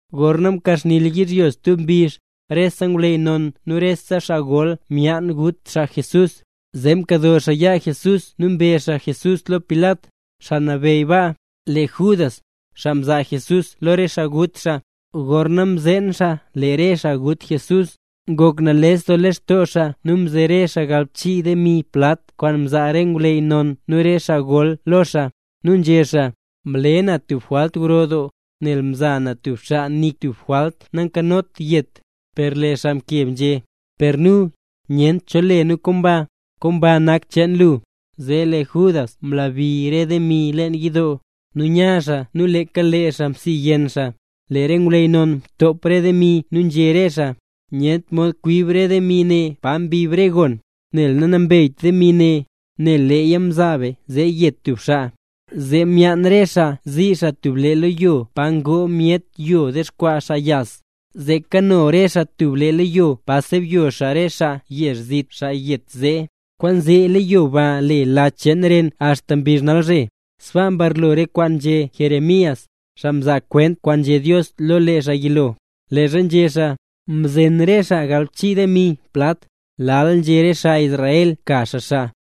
Gorna mkaxni yizhyo stub mbizh, rese ngwleyy non nu re xaa gol myaan gut xaa Jesús. Zee mkado xaa yaa Jesús nu mbe xaa Jesús lo Pilat, xaa nabeyy baa. Lee Judas, xaa mzaa Jesús lo re xaa gut xaa, gorna mzeen xaa lee re xaa gut Jesús, ngok nales doo lextoo xaa nu mzere xaa galbchii demi plat kwaan mzaa re ngwleyy non nu re xaa gol lo xaa. Nu nzhé xaa: —Mle na tub jwalt gro doo nel mza na tub xaa nik tub jwalt nankanot yet. Per lee re xaa mkeb nzhé: —Per nu, nyent cho le nu komba. ¡Komba nak xcheen lu! Zee lee Judas mlabi re demi leen yidoo, nu nya xaa nu leeka lee xaa msiyenn xaa. Lee re ngwleyy non mtop re demi nu nzhé re xaa: —Nyent mod kwib re demi ne pa mbib re gon, nel nanambeyt demi ne, nel leeya mzaa be zee yet tub xaa. Zee myaan re xaa zii xaa tub lee leyo, pa ngoo myet yo ndexkwaa xaa yas; zee kano re xaa tub lee leyo pa sebyo xaa re xaa yezh zit, xaa yet zee. Kwaanzee leyo ba le Lach Cheen Ren axta mbizh nalzhe. Sbaa mbarlo re kwaan nzhé Jeremías, xaa mzaa kwent kwaan nzhé Dios lo lee xaa yilo, leezha nzhé xaa: “Mzen re xaa galbchii demi plat, lal nzhé re xaa Israel ka xaa xaa.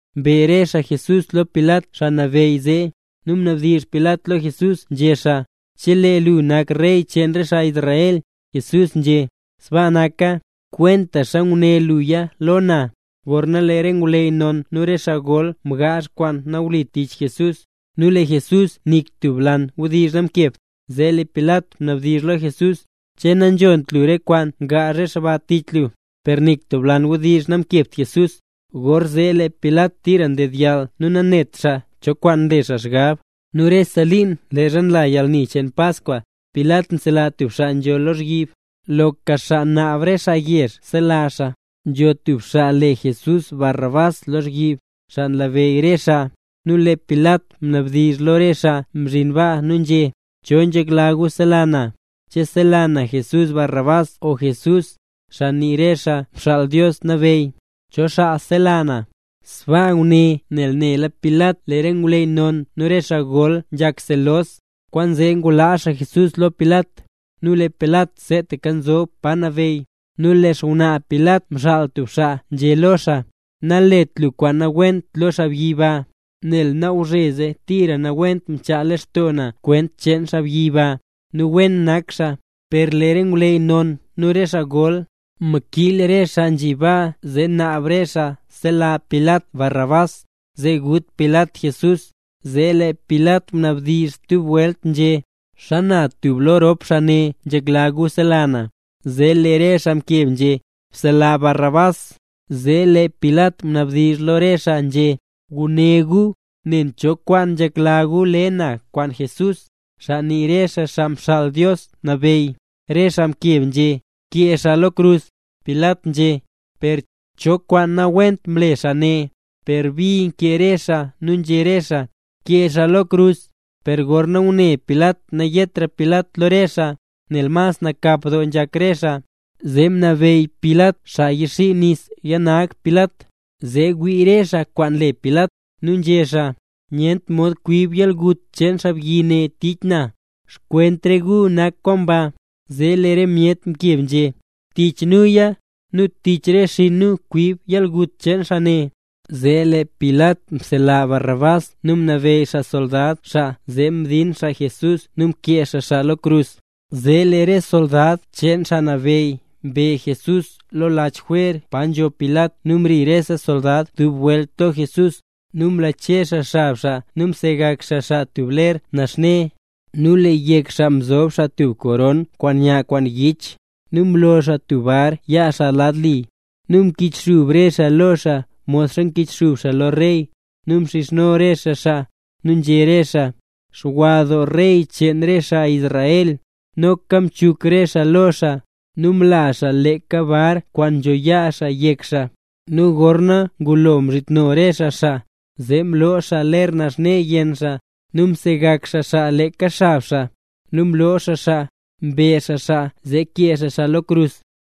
Mbe re xaa Jesús lo Pilat xaa nabeyy zee. Nu mnabdizh Pilat lo Jesús nzhé xaa: —¿Che lu nak Rey cheen re xaa Israel? Jesús nzhé: —Sbaa naka, kwentaxa nguné luya lo na. Gorna lee re ngwleyy non nu re xaa gol mgaazh kwaan nawlit tich Jesús, nu lee Jesús nik tub lan wdizh namkebt, zee lee Pilat mnabdizh lo Jesús: —¿Che nanzhont lu re kwaan gaazh re xaa tich lu? Per nik tub lan wdizh namkebt Jesús, gorzee lee Pilat tira mdedyall nu nanetra xaa cho kwaan nle xaa xgab. Nu rese liin leezha nla yalni cheen Paskwa, Pilat nsela tub xaa nzho lozhyib, loka xaa naab re xaa yezh sela xaa. Nzho tub xaa le Jesús Barrabás lozhyib, xaa nlabeyy re xaa. Nu lee Pilat mnabdizh lo re xaa nzhi baa nu nzhé: —¿Cho nzhekla gu sela na? ¿Che sela na Jesús Barrabás o Jesús, xaa nii re xaa Xaa Mxaal Dios Nabeyy? ¿Cho xaa sela na? Sbaa nguné nel nela Pilat lee re ngwleyy non nu re xaa gol nzhak selos, kwaanzee ngulaa xaa Jesús lo Pilat. Nu lee Pilat seetaka nzob pa nabeyy, nu lee xngwnaa Pilat mxaal tub xaa nzhé lo xaa: —Nalet lu kwaan nawent lo xaabyi ba, nel nalgwzheze tira nawent mchaa lextoo na kwent cheen xaabyi ba, nu wen nak xaa. Per lee ngwleyy non nu re xaa gol, mkiil re xaa nzhi baa zee naab re xaa sela Pilat Barrabás, zee gut Pilat Jesús. Zee lee Pilat mnabdizh stub welt nzhé: —¿Xana tub lo rop xaa ne nzhekla gu sela na? Zee lee re xaa mkeb nzhé: —Bsela Barrabás. Zee lee Pilat mnabdizh lo re xaa nzhé: —Guné gu, nen cho kwaan nzhekla gu le na kwaan Jesús, xaa nii re xaa Xaa Mxaal Dios Nabeyy. Re xaa mkeb nzhé: —¡Bkee xaa lo krus! Pilat nzhé: —Per, ¿cho kwaan nawent mle xaa ne? Per bi nkee re xaa nu nzhé re xaa: —¡Kee xaa lo krus! Gorna ngune Pilat nayetra Pilat lo re xaa, nel mas nakap doo nzhak re xaa, zee mnabeyy Pilat xaa yixii nis yanag Pilat, zee wii re xaa kwaan le Pilat. Nu nzhé xaa: —Nyent mod kwib yalgut cheen xaabyi ne tich na; xkwent re gu nak kwaan ba. Zee lee re myet mkeb nzhé: —¡Tich nuya, nu tich re xinn nu kwib yalgut cheen xaa ne! Zee lee Pilat msela Barrabás nu mnabeyy xaa xsoldad xaa zee mdin Jesús nu kee xaa xaa lo krus. Zee lee re soldad cheen xaa nabeyy mbe Jesús lo lach jwer pa nzho Pilat nu mri rese soldad dub welt lo Jesús. Nu mlache xaa xab xaa nu msegak xaa xaa tub ler naxne. Nu lee yek xaa mzob xaa tub koron kwaan nya kwaan yich, nu mlo xaa tub bar yaa xaa lad li. Nu mkichxub re xaa lo xaa modxa nkichxub xaa lo rey, nu mxizhno re xaa xaa, nu nzhé re xaa: —¡Xwa doo Rey cheen re xaa Israel! Noka mchuk re xaa lo xaa, nu mla xaa leeka bar kwaan nzho yaa xaa yek xaa. Nu gorna ngulo mzhitno re xaa xaa, zee mloo xaa ler naxne yenn xaa, nu msegak xaa xaa leeka xab xaa. Nu mloo xaa xaa, mbe xaa xaa zee kee xaa xaa lo krus.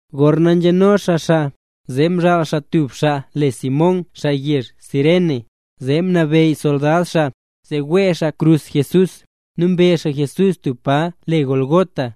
Gorna nzheno xaa xaa, zee mzhaal xaa tub xaa le Simón xaa yezh Cirene, zee mnabeyy soldad xaa, zee wee xaa xkrus Jesús. Nu mbe xaa Jesús tub pa le Gólgota.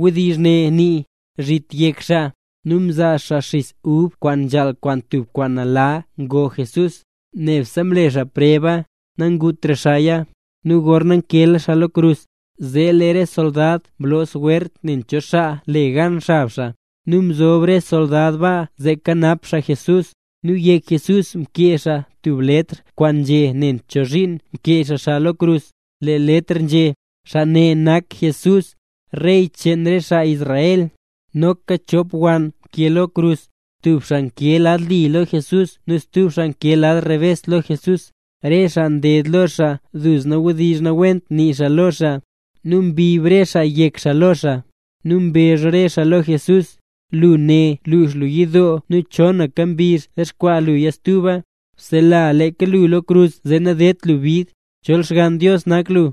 (Wdizh ne nii: “Zhit Yek Xaa”.) Nu mzaa xaa xis ub kwaan nzhaal kwaan tub kwaan nala ngo Jesús. Nebse mle Jesús preba, nangutra xaaya. Nu gorna mkeela xaa lo krus, zee lee re soldad mloo swert nen cho xaa le gan xab xaa. Nu mzob re soldad baa zee kanap xaa Jesús. Nu yek Jesús mkee xaa tub letr kwaan nzhé nen chozhiin mkee xaa Jesús lo krus. Lee letr nzhé: “XAA NE NAK JESÚS, REY CHEEN RE XAA ISRAEL”. Noka chop wann nkee lo krus, tub xaa nkee lad li lo Jesús nu stub xaa nkee lad rebes lo Jesús. Re xaa nded lo xaa duzna wdizh nawent nii xaa lo xaa, nu mbib re xaa yek xaa lo xaa. Nu mbezh re xaa lo Jesús: —Lu né lux lu yidoo nu chonaka mbizh dexkwaa luya stuba. ¡Bsela leeka lu lo krus zee nadedt lu bid, chol Xgann Dios nak lu!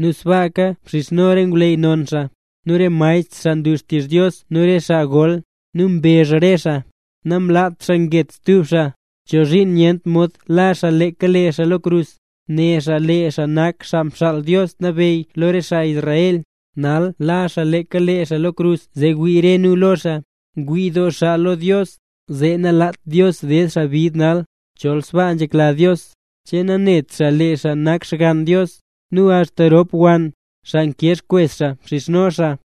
Nu sbaaka mxizhno re ngwleyy non xaa, nu re maestr xaa nlu xtizh Dios nu re xaa gol, nu mbezh re xaa: —Namlaat xaa nget stub xaa, ¿chozhiin nyent mod la xaa leeka xaa lo krus? Né xaa lee xaa nak Xaa Mxaal Dios Nabeyy lo re xaa Israel. Nal la xaa leeka lee xaa lo krus zee wii re nu lo xaa. Ngwii doo xaa lo Dios, laa zee nalaat Dios ded xaa bid nal, chol sbaa nzhekla Dios. ¿Che nanét xaa lee xaa nak Xgann Dios? Nu axta rop wann, xaa nkee xkwes xaa mxizhno xaa.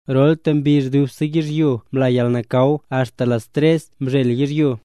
Rolta mbizh dubse yizhyo mla yalnakaw axta las tres mzhel yizhyo.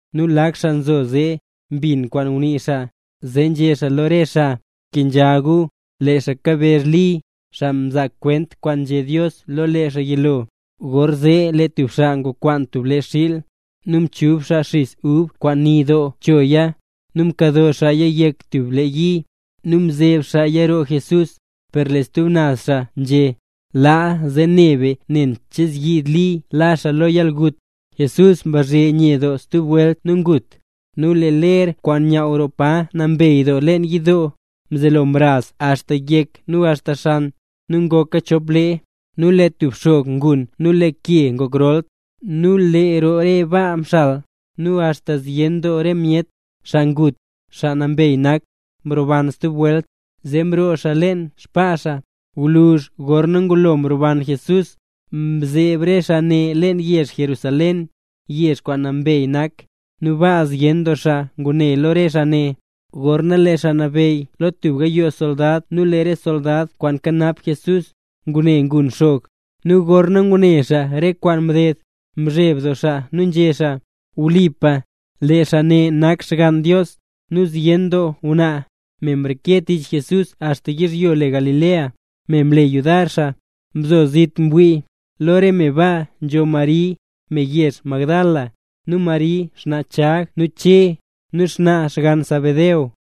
Nu lak xaa nzo zee, mbin kwaan ngunii xaa, zee nzhé xaa lo re xaa: —Bkenzha gu. Lee xaa kabezh Li, xaa mzaa kwent kwaan nzhé Dios lo lee xaa yilo. Gorzee lee tub xaa ngwakwaan tub lee xiil, nu mchub xaa xis ub kwaan ni doo chooya, nu mkado xaaya yek tub le yi, nu mzeb xaaya roo Jesús. Per lee stub naz xaa nzhé: —Laa, zee ne be nen che zyiid Li la xaa lo yalgut. Jesús mbazhe nye doo stub welt nu ngut. Nu lee ler kwaan nyaaw roo Pa Nambey Doo leen yidoo, mzelo mraz axta yek nu axta xan, nu ngoka chop lee. Nu lee tub xog mgun nu lee re ke ngok rol. Nu lee roo re baa mxal; nu axta zyen doo re myet, xaa ngut, xaa nambey nak, mroban stub welt. Zee mroo xaa leen xbaa xaa. Gwluzh gorna ngulo mroban Jesús, mzeeb re xaa ne leen yezh Jerusalén, yezh kwaan nambey nak, nu baa zyen doo xaa ngune lo re xaa ne. Gorna lee xaa nabeyy lo tub gayoo soldad nu re soldad kwaan nkanap Jesús, ngune mgun xog, nu gorna ngune xaa re kwaan mded, mzheb doo xaa nu nzhé xaa: —Wlipa, lee xaa ne nak Xgann Dios. Nu zyen doo ngwnaa, me mreke tich Jesús axta yizhyo le Galilea, me mle yudar xaa, mzo zit ngwii. Lo re me ba mzo Mari, me yezh Magdala, nu Mari xnaa Chag nu Che, nu xnaa xgann Zebedeo.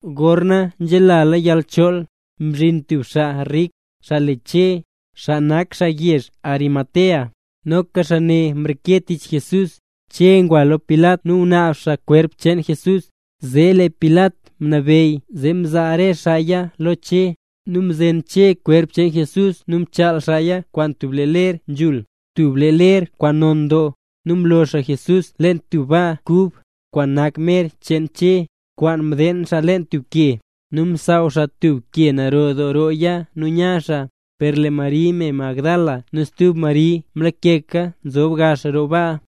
Gorna nzhelala yalchool, mzhin tub xaa rik, xaa le Che, xaa nak xaa yezh le Arimatea. Noka xaa ne mreke tich Jesús. Che ngwa lo Pilat nu ngunaab xaa kwerp cheen Jesús. Zee lee Pilat mnabeyy zee mzaa re xaaya lo Che. Nu mzen Che xkwerp Jesús nu mchaal xaaya kwaan tub lee ler nzhul, tub lee ler kwaan non doo. Nu mlo xaa Jesús leen tub baa kub, kwaan nak mer cheen Che, kwaan mdeen xaa leen tub ke. Nu msaaw xaa tub ke naro doo rooya nu nya xaa. Per lee Mari me Magdala nu stub Mari mlakeka nzob gax roo baa.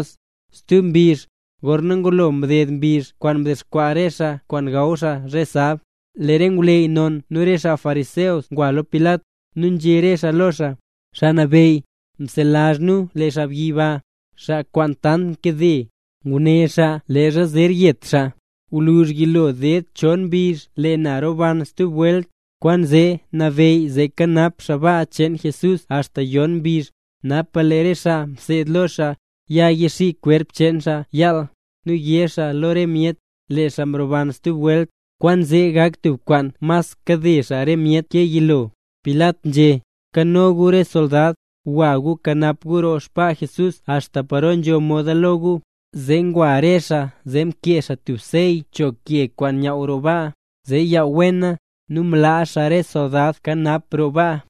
Stub mbizh, gorna ngulo mded mbizh kwaan ndexkwaa re be kwaan gaw be zhe sab, lee re ngwleyy non nu re xaa fariseo ngwa lo Pilat, nu nzhé re xaa lo xaa: —Xaa nabeyy, mselazh nu lee xaabyi ba, xaa kwaan tant mkade, nguné xaa leezha zer yet xaa: “Gwluzh yilo ded chon mbizh, lee na roban stub welt”. Kwaanzee nabeyy zee kanap xaa baa cheen Jesús axta yixoob yon mbizh, napa lee re xaa mseed lo xaa, ya yixii kwerp cheen xaa yaal, nu yé xaa lo re myet: “Lee xaa mroban stub welt”. Kwaan zee gak tub kwaan mas kade xaa re myet ke yilo. Pilat nzhé: —Nkano gu re soldad, gwa gu kanap gu roo xbaa Jesús axta paro nzho moda lo gu. Zee ngwa re xaa zee mkee xaa tub sey cho ke kwaan nyaaw roo baa, zee yaww wena, nu mlaa xaa re soldad kanap roo baa.